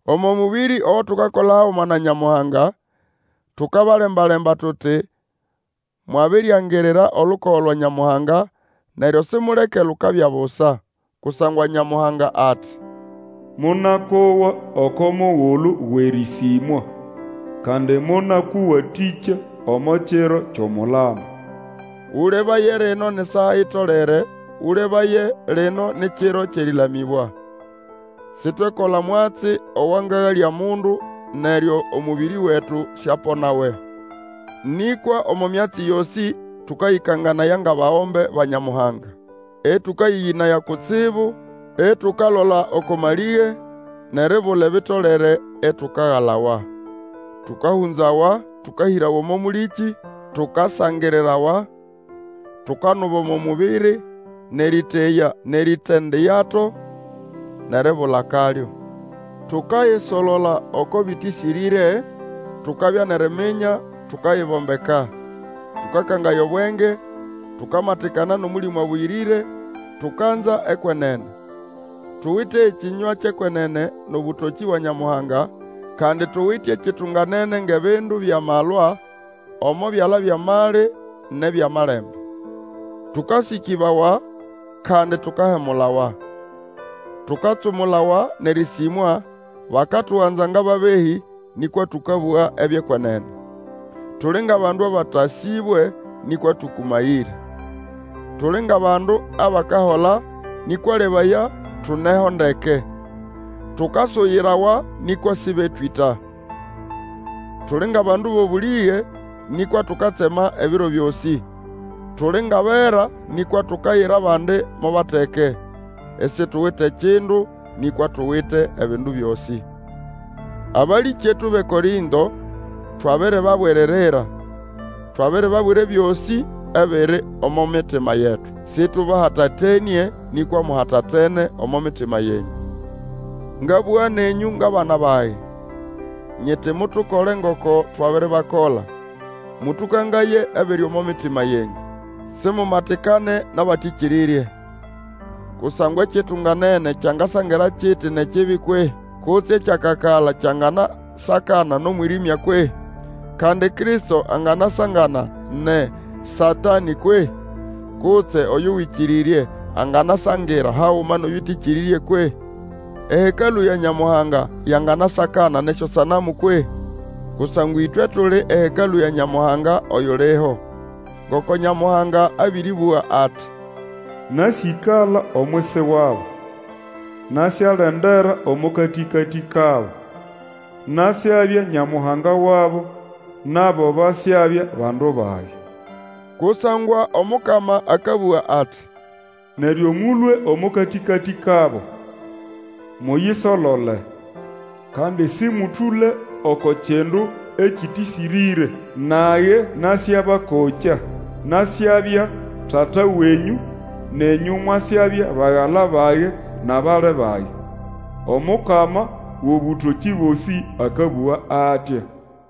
Omo mũbĩrĩ ogo tukakola haguma na Nyamuhanga, tukabalemba-lemba tuti mwabiriangirira olukogo lwa Nyamuhanga, neryo simuleke lukabya busa. Kusangwa Nyamuhanga ati, Monakowa oko mugulu wʼerĩsĩmwa, Kandi monakũwatĩkya omo kiro kyʼomulamo. Ũlebaye, lino ni saa itolere, Ũlebaye, lino ni kiro kyʼerĩlamĩbwa. Sitwekola omwatsi owangagalya mundu, neryo omũbĩrĩ wetu siaponawe. Nĩkwa omo myatsi yosĩ tũkayĩkanganaya ngʼabagombe ba Nyamuhanga, ĩtũkayĩyĩnaya kutsibu, itukalola oko malĩge, nʼeribula ebitolere, itukagalawa. Tũkahũnzawa, tũkahĩrawa omo mũlĩkĩ, tukasangirirawa, tukanuba omo mũbĩrĩ, nʼerĩteya nʼeritindayato, nʼeribula akalyo. Tukayisolola oko bĩtĩsĩrĩre, tukabya nʼeriminya, tukayibombeka, tũkakangaya obwenge, tukamatikana nʼOmũlĩmũ Abũyĩrĩre, tukanza ekwenene. Tuwite ekĩnywa kyʼekwenene, nʼobũtokĩ bwa Nyamuhanga, kandi tuwite ekitunganene ngʼebindu byʼamalwa omo byala byʼamali nʼebyʼamalembe. Tũkasĩkĩbawa, kandi tukahemulawa; tukatsumulawa, nʼerĩsĩmwa, bakatuganza ngʼababehĩ, nĩkwa tũkabũga ebyʼekwenene. Tuli ngʼabandu abatasĩbwe, nĩkwa tũkũmayĩre; tuli ngʼabandu abakahola, nĩkwa lebaya, tuneho ndeke. Tukasuyirawa, nĩkwa sĩbetwĩta. Tuli ngʼabandu bʼobũlĩge, nĩkwa tukatsema ebiro byosĩ; tuli ngʼabera, nĩkwa tukayira abandi mo bateke; isituwite kindu, nĩkwa tuwite ebindu byosĩ. Abalĩkyetu bʼeKorĩnto, twabiribabwiririra, twabiribabwira ebyosĩ ebiri omo mitima yetu. Sĩtũbahatatenĩe, nĩkwa muhatatene omo mitima yenyũ. Ngabũga nenyũ ngʼabana bage, nyiti mutukole ngoko twabiribakola, mũtũkangaye ebiri omo mitima yenyũ. Simumatikane nʼabatĩkĩrĩrye; kusangwa ekitunganene kyangasangira kiti nʼekibi kwehĩ? Kutse ekyakakala kyanganasakana nʼomwĩrĩmya kwehĩ? Kandi Kristo anganasangana nʼeSatanĩ kwehĩ? Kutse oyo Wĩkĩrĩrye anganasangira haguma nʼoyũtĩkĩrĩrye kwehĩ? Ehekalũ ya Nyamuhanga yanganasakana nʼesyosanamu kwehĩ? Kusangwa ĩtwe tuli ehekalũ ya Nyamuhanga oyuliho. Ngoko Nyamuhanga abĩrĩbũga ati, Nasyĩkala omwisi wabo, nasyalendera omo katĩkatĩ kabo; Nasyabya Nyamuhanga wabo, nabo basyabya bandu bage. Kusangwa Omukama akabũga ati, Neryo mũlũe omo katĩkatĩ kabo, muyisolole. Kandi sĩmũtũle oko kindu ekĩtĩsĩrĩre. Nage nasyabakokya, Nasyabya Tata wenyũ, Nenyũ mwasyabya bagala bage nʼabali bage, Omukama wʼobũtokĩ Bosĩ akabũga atya.